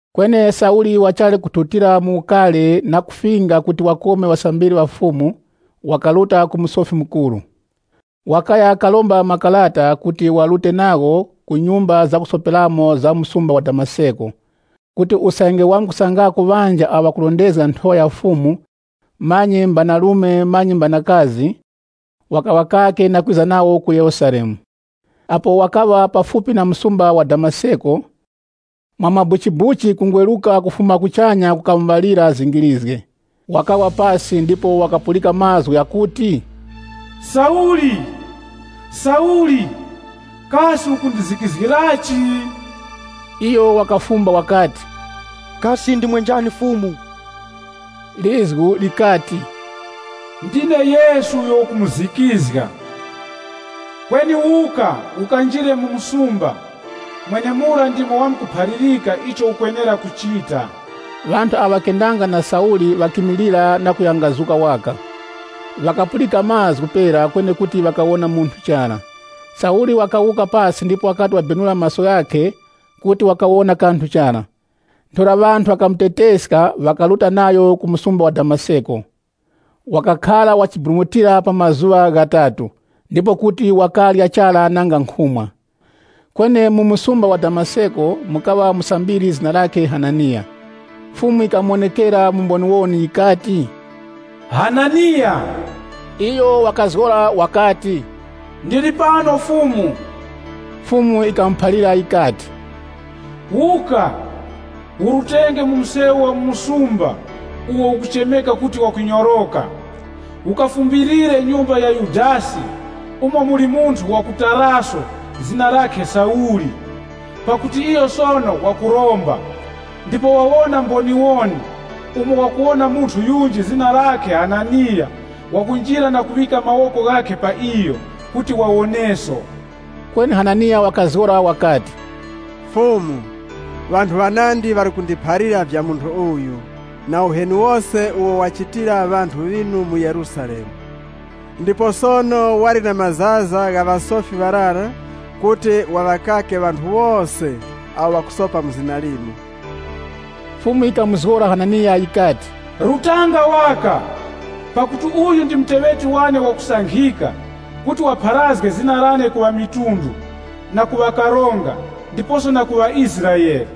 Kweni Sauli wachali kuthutira mu ukari na kufinga kuti wakome ŵasambiri ŵa Fumu, wakaruta ku Musofi Mukuru. Wakaya karomba makarata kuti warute nagho ku nyumba zakusoperamo za mu msumba wa Damaseko, kuti usange wamkusangako ŵanji awo ŵakurondezga Nthowa ya Fumu, manyi mbanarume manyi mbanakazi, wakaŵakake na kwiza nawo ku Yerusalemu. Apo wakaŵa pafupi na msumba wa Damaseko, mwa mabuchibuchi kungweruka kufuma kuchanya kukamuŵalira zingirizge. Wakawa pasi ndipo wakapulika mazgu ghakuti, “Sauli, Sauli! Kasi ukundizikizgirachi?” Iyo wakafumba wakati, “Kasi ndimwe njani Fumu?” Lizgu likati, “Ndine Yesu uyo ukumuzikizga. Kweni wuka ukanjire mu msumba, mwenemura ndimo ŵamuphalirika icho ukwenera kuchita.” Ŵanthu awo ŵakendanga na Sauli ŵakimilira na kuyangazuka waka. Ŵakapulika mazgu pera kweni kuti ŵakawona munthu chara. Sauli wakawuka pasi ndipo wakati wabenula maso ghakhe kuti wakawona kanthu chara. Ntheura ŵanthu ŵakamuteteska, ŵakaruta nayo ku msumba wa Damaseko. Wakakhara wachiburumutira pa mazuŵa ghatatu, ndipo kuti wakarya chara nanga nkhumwa. Kweni mu msumba wa Damaseko mukaŵa musambiri zina lakhe Hananiya. Fumu yikamuwonekera mu mboniwoni yikati, “Hananiya!” Iyo wakazgora wakati, “Ndili pano Fumu.” Fumu yikamuphalira yikati, “Wuka, urutenge mu msewu wa mu msumba uwo ukuchemeka kuti Wakunyoroka. Ukafumbilire nyumba ya Yudasi umo muli munthu wa ku Taraso zina lakhe Sauli. Pakuti iyo sono wakuromba, ndipo wawona mboniwoni umo wakuwona munthu yunji zina lakhe Hananiya wakunjira na kuŵika mawoko ghakhe pa iyo kuti wawoneso.” Kweni Hananiya wakazgora wakati, “Fumu, ŵanthu ŵanandi ŵali kundiphalira vya munthu uyu na uheni wose uwo wachitira ŵanthu ŵinu mu Yerusalemu. Ndipo sono wali na mazaza gha ŵasofi ŵarara kuti waŵakake ŵanthu wose awo ŵakusopa mu zina linu.” Fumu yikamuzgora Hananiya yikati, “Rutanga waka! Pakuti uyu ndi muteŵeti wane wakusankhika kuti wapharazge zina lane ku ŵamitundu, na ku ŵakaronga, ndiposo na ku ŵaIsraele.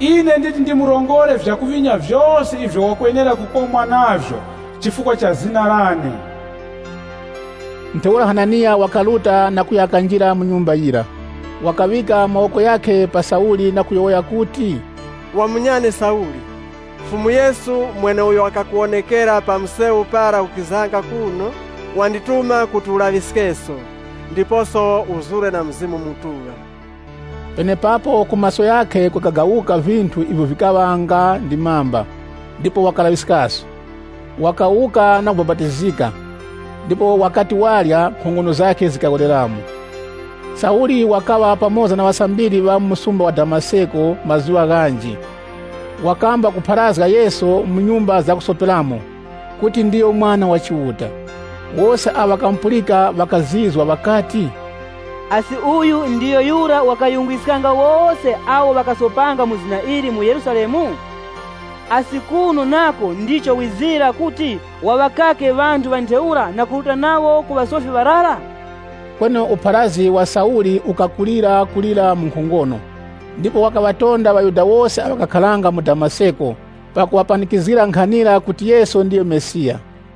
Ine nditi ndimurongore vyakuŵinya vyose ivyo wakwenera kukomwa navyo chifukwa cha zina lane.” Ntheura Hananiya wakaruta na kuya kanjira mu nyumba yira. Wakaŵika mawoko ghakhe pa Sauli na kuyowoya kuti, “Wa munyane Sauli, Fumu Yesu mweneuyo wakakuwonekera pa msewu para ukizanga kuno wandituma kuti ulaŵiskeso ndiposo uzure na Mzimu Mutuŵa.” Penepapo ku maso ghakhe kukagagawuka vinthu ivyo vikaŵa nga ndi mamba, ndipo wakalaŵiskaso. Wakawuka na kubapatizika, ndipo wakati warya, nkhongono zakhe zikawereramo. Sauli wakupharazga mu Damaseko Sauli wakaŵa pamoza na ŵasambiri ŵa mu msumba wa Damaseko mazuŵa ghanji. Wakamba kupharazga Yesu mu nyumba zakusoperamo, kuti ndiyo Mwana wa Chiuta. Wose awo ŵakamupulika ŵakazizwa ŵakati, “Asi uyu ndiyo yura wakayungwiskanga wose awo ŵakasopanga mu zina ili mu Yerusalemu? Asi kuno nako ndicho wizira kuti waŵakake ŵanthu ŵa ntheura na kuruta nawo ku ŵasofi ŵarara?” Kweni upharazgi wa Sauli ukakulirakulira mu nkhongono, ndipo wakaŵatonda ŵaYuda wose awo ŵakakharanga mu Damaseko pakuŵapanikizgira nkhanira kuti Yesu ndiyo Mesiya.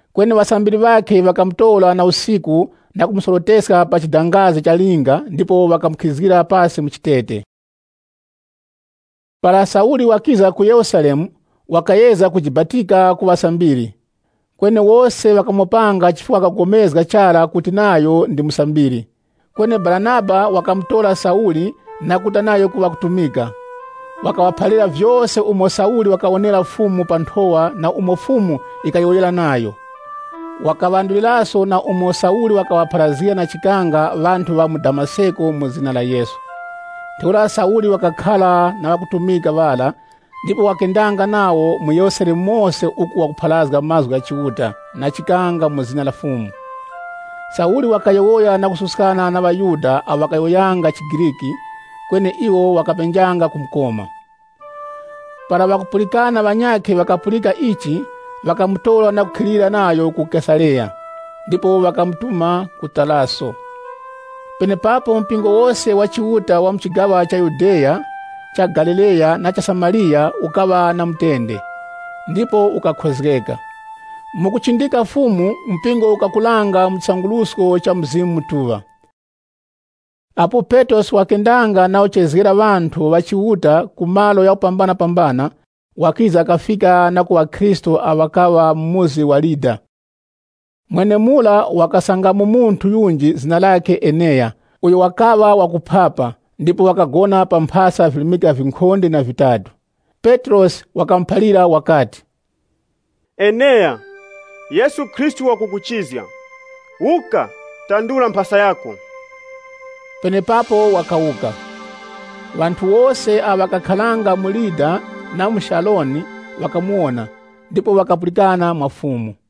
Kweni ŵasambiri ŵakhe ŵakamutora na usiku na kumusoroteska pa chidangazi cha linga ndipo ŵakamukhizgira pasi mu chitete. Para Sauli wakiza ku Yerusalemu, wakayezga kujibatika ku ŵasambiri. Kweni wose ŵakamopanga chifukwa ŵakagomezga chara kuti nayo ndi musambiri. Kweni Baranaba wakamutora Sauli na kuruta nayo kuŵakutumika. Wakaŵaphalira vyose umo Sauli wakawonera Fumu pa nthowa na umo Fumu yikayowoyera nayo. Wakaŵanduliraso na umo Sauli wakaŵapharazgira na chikanga ŵanthu ŵa mu Damaseko mu zina la Yesu. Ntheura Sauli wakakhara na ŵakutumika ŵara ndipo wakendanga nawo mu Yerusalemu mose uku wakupharazga mazgu gha Chiuta na chikanga mu zina la Fumu. Sauli wakayowoya na kususkana na ŵaYuda awo ŵakayowoyanga chiGriki, kweni iwo ŵakapenjanga kumukoma. Para ŵakupulikana ŵanyakhe ŵakapulika ichi, ŵakamutora na kukhilira nayo ku Kesareya, ndipo ŵakamutuma ku Taraso. Penepapo mpingo wose wa Chiuta wa mu chigaŵa cha Yudeya, cha Galileya na cha Samariya ukaŵa na mutende, ndipo ukakhozgeka. Mu kuchindika Fumu, mpingo ukakuranga mu chisangurusko cha Mzimu Mutuŵa. Apo Petrosi wakendanga na kuchezgera ŵanthu ŵa Chiuta ku malo ghakupambanapambana, wakiza kafika na ku ŵakhristu awo ŵakakharanga mu muzi wa Lida. Mwenemura wakasangamo munthu yunji zina lakhe Eneya, uyo wakaŵa wakuphapa, ndipo wakagona pa mphasa virimika vinkhonde na vitatu. Petrosi wakamuphalira wakati, “Eneya, Yesu Khristu wakukuchizga. Wuka, tandura mphasa yako.” Penepapo wakawuka. Ŵanthu wose awo ŵakakharanga mu Lida na mu Sharoni ŵakamuwona, ndipo ŵakapulikana mwa Fumu.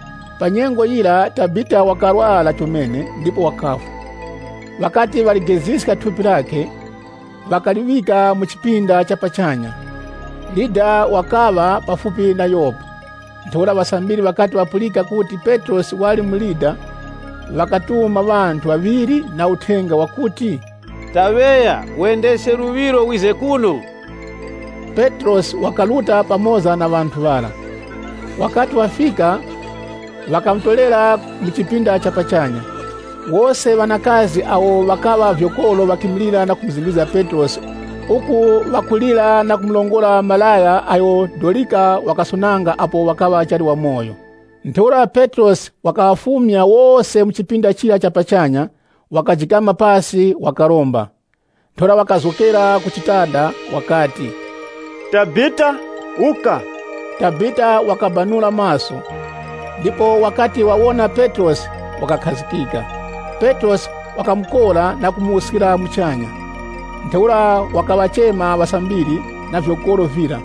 Pa nyengo yira Tabita wakarwara chomene ndipo wakafwa. Ŵakati ŵaligeziska thupi lakhe, ŵakaliŵika mu chipinda cha pachanya. Lida wakaŵa pafupi na Yopa. Ntheura ŵasambiri ŵakati ŵapulika kuti Petrosi wali mu Lida, ŵakatuma ŵanthu ŵaŵiri na uthenga wakuti, “Taŵeya wendeske luŵiro wize kuno” Petrosi wakaruta pamoza na ŵanthu ŵara. Wakati wafika, ŵakamutorera mu chipinda cha pachanya. Wose ŵanakazi awo ŵakaŵa vyokoro ŵakimilira na kumuzingirizga Petrosi uku ŵakulira na kumurongora malaya agho Dorika wakasonanga apo wakaŵa wachali wamoyo. Ntheura Petrosi wakaŵafumya wose mu chipinda chira cha pachanya, wakajikama pasi wakaromba. Ntheura wakazgokera ku chitanda wakati, “Tabita, wuka!” Tabita wakabanula maso, ndipo wakati wawona Petrosi wakakhazikika. Petrosi wakamukora na kumuwuskira muchanya. Ntheura wakaŵachema ŵasambiri, na vyokoro vira,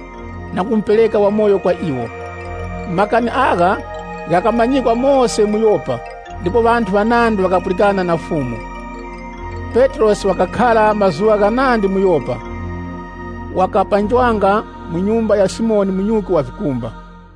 na kumupereka wamoyo kwa iwo. Makani agha ghakamanyikwa mose mu Yopa, ndipo ŵanthu ŵanandi ŵakapulikana na Fumu. Petrosi wakakhara mazuŵa ghanandi mu Yopa, wakapanjwanga mu nyumba ya Simoni munyuki wa vikumba.